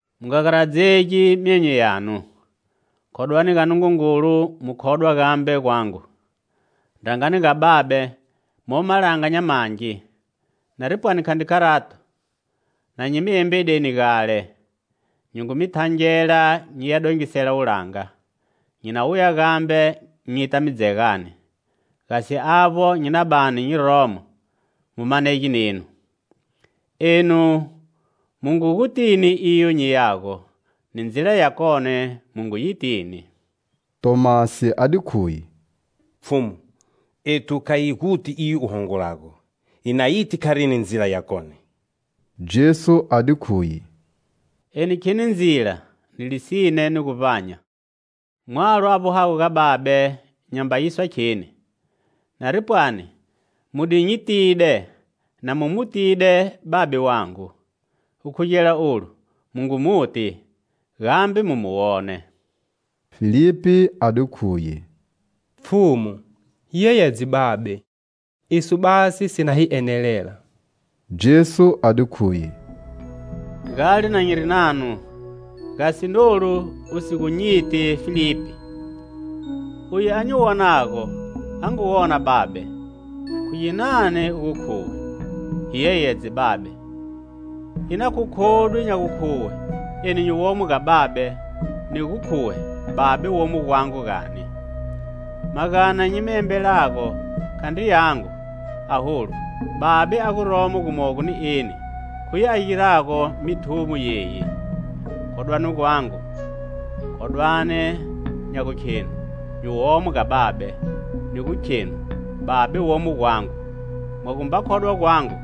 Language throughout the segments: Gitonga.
"Mu nga garadzegi myonyo yanu. Khodwani ga Nungungulu, mu khodwa gambe gwangu. Ndrangani ga Babe momo malanga nya mangi. Nari pwani khandri kharato, na nyi mi embedeni gale. Nyi ngu mi thangela nyiya dongisela wulanga. Nyi na wuya gambe nyita mi dzegani, gasi avbo nyi na bani nyi romo, mu manege nenu. Enu mu ngu gutini iyo nyiyago, ni ndzila yakone mu ngu yitini." Tomasi a di khuye: "Pfhumu, ethu kha hi guti iyo u hongolago, hi na yiti kharini ndzila yakone?" Jesu a di khuye: "Eni kheni ndzila, ni lisine, ni guvbanya. Mwalo a vbohago ga Babe nyamba yiswa kheni. Nari pwani mu di nyitide na mu mu tide Babe wangu: gukhugela olu mu ngu muti, gambe mu mu wone." Filipi a di khuye: "Pfhumu, hi yeyedze Babe, iso basi si na hi enelela." Jesu a di khuye: "Gale na nyiri nanu, gasi nolu u si gu nyiti, Filipi? Uye a nyi wonago, a ngu wona Babe. Khu ginani u gu khuwe: 'Hi yeyedze Babe?' Ina khu khodwi nya gukhuwe eni nyi womo ga Babe, ni gu khuwe Babe womo gwangu, gani? Magana nyi mi embelago khandri yangu, aholu, Babe a guromo gumogo ni eni, khuye a girago mithumo yeyi. Khodwani gwangu; khodwani nya gukhenu nyi womo ga Babe, ni gu khenu Babe womo gwangu. Mwa gumba khodwa gwangu,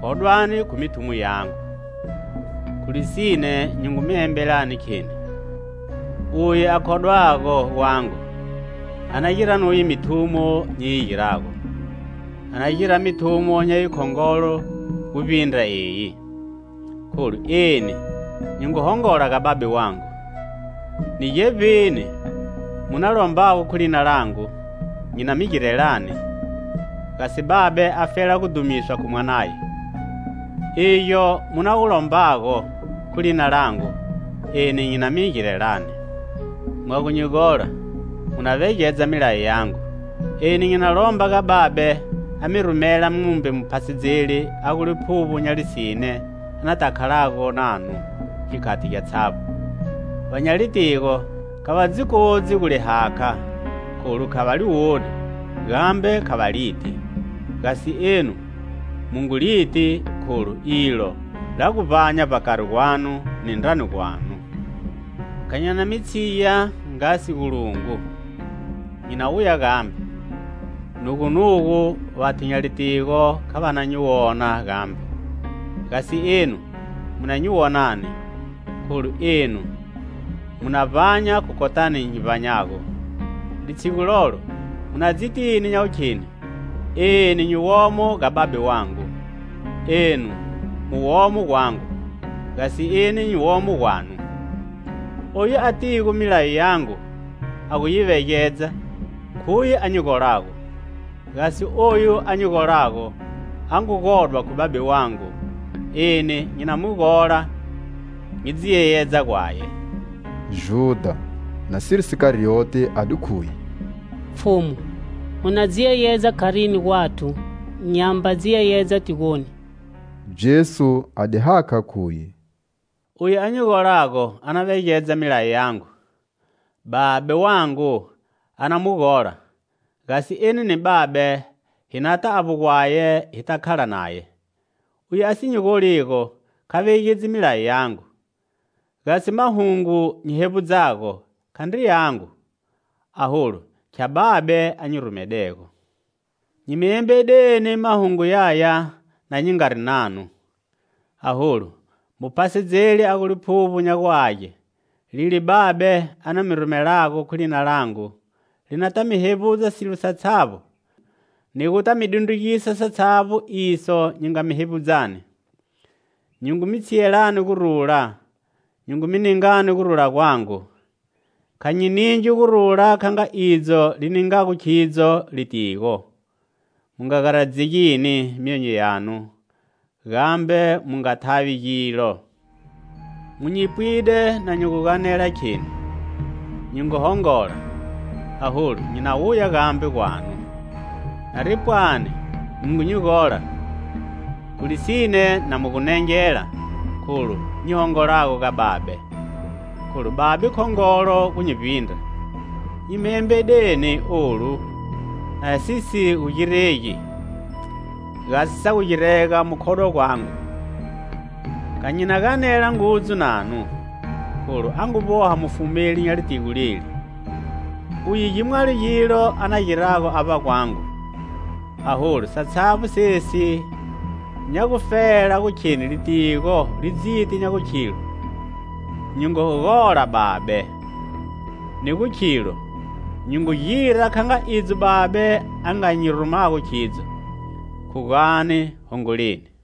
khodwani khu mithumo yangu. Khu lisine, nyi ngu mi embelani, kheni: uye a khodwago gwangu, a na gira nuye mithumo nyi yi girago; a na gira mithumo nya yikhongolo gu vbindra eyi, kholu eni nyi ngu hongola ga Babe wangu. Ni gevbini mu na lombago khu lina langu, nyi na mi girelani, gasi Babe afela gudhumiswa khu Mwanaye. Igyo mu na gu lombago khu lina langu, eni nyi na mi girelani. "Mwa gu nyi gola, mu na vegedza milayo yangu. Eni nyi na lomba ga Babe, a mi rumela mumbe Muphasedzeli a gu Liphuvbo nya lisine anata khalago nanu gikhati gyatshavbo. Va nya litigo kha va dzi kodzi gu li hakha, kholu kha va li woni gambe kha va liti. Gasi enu mu ngu liti kholu ilo la gu vbanya vbakari gwanu ni ndrani gwanu. "Kha nyi na mi tshiya nga sigulungu; nyi na wuya gambe. Nugunugu, vathu nya litigo kha va na nyi wona gambe, gasi enu mu na nyi wonani; kholu enu mu na vbanya khu kotani nyi vbanyago. Litshigu lolo mu na dzitini nya gukhenu eni nyi womo ga Babe wangu, enu mu womo gwangu, gasi eni nyi womo gwanu. "Oyu atigo milayo yangu, a gu yi vegedza, khuye a nyi golago. Gasi oyu a nyi golago, a ngu godwa khu Babe wangu, eni nyi na mu gola nyi dzi yeyedza gwaye." Judha, nasiri Sikarioti, a di khuye: "Pfhumu, u na dzi yeyedza kharini gwathu, nyamba dzi yeyedza tigoni?" Jesu a di hakha, khuye: "Uye a nyi golago, a na vegedza milayo yangu; Babe wangu a na mu gola; gasi eni ni Babe hi nata avbo gwaye hita khala naye. Uye a si nyi goligo, kha vegedzi milayo yangu; gasi mahungo nyi hevbudzago khandri yangu, aholu khya Babe a nyi rumedego. Nyi mi embedeni mahungu yaya na nyi ngari nanu. Aholu, Muphasedzeli, a gu Liphuvbo nya gu Age, lile Babe a na mi rumelago khu lina langu, li nata mi hevbudza silo satshavbo, ni guta mi dundrugisa satshavbo iso nyi nga mi hevbudzani. "Nyi ngu mi tshiyelani gurula, nyi ngu mi ningani gurula gwangu. Kha nyi ningi gurula kha nga idzo li ningago khidzo litigo. Mu nga garadzegini myonyo yanu, gambe mu nga thavi gilo. Mu nyi pwide na nyi gu ganela, kheni: nyi ngu hongola, aholu nyi na wuya gambe gwanu. Nari pwani mu ngu nyi gola, khu lisine na mu gu nengela kholu nyi hongolago ga Babe, kholu Babe khongolo gu nyi vbindra. Nyi mi embedeni olu, na si si gu giregi, gasi sa gu girega mu khodwa gwanyu. Kha nyi na ganela ngudzu nanu, kholu a ngu vboha mufumeli nya litigo leli. Uye gimwalo gilo a na girago avba gwangu, aholu, satshavbo sesi nya gufela gu kheni litigo li dziti nya gu khilo nyi ngu gola Babe, ni gu khilo nyi ngu gira kha nga idzo Babe a nga nyi rumago khidzo. Khugani, hongoleni."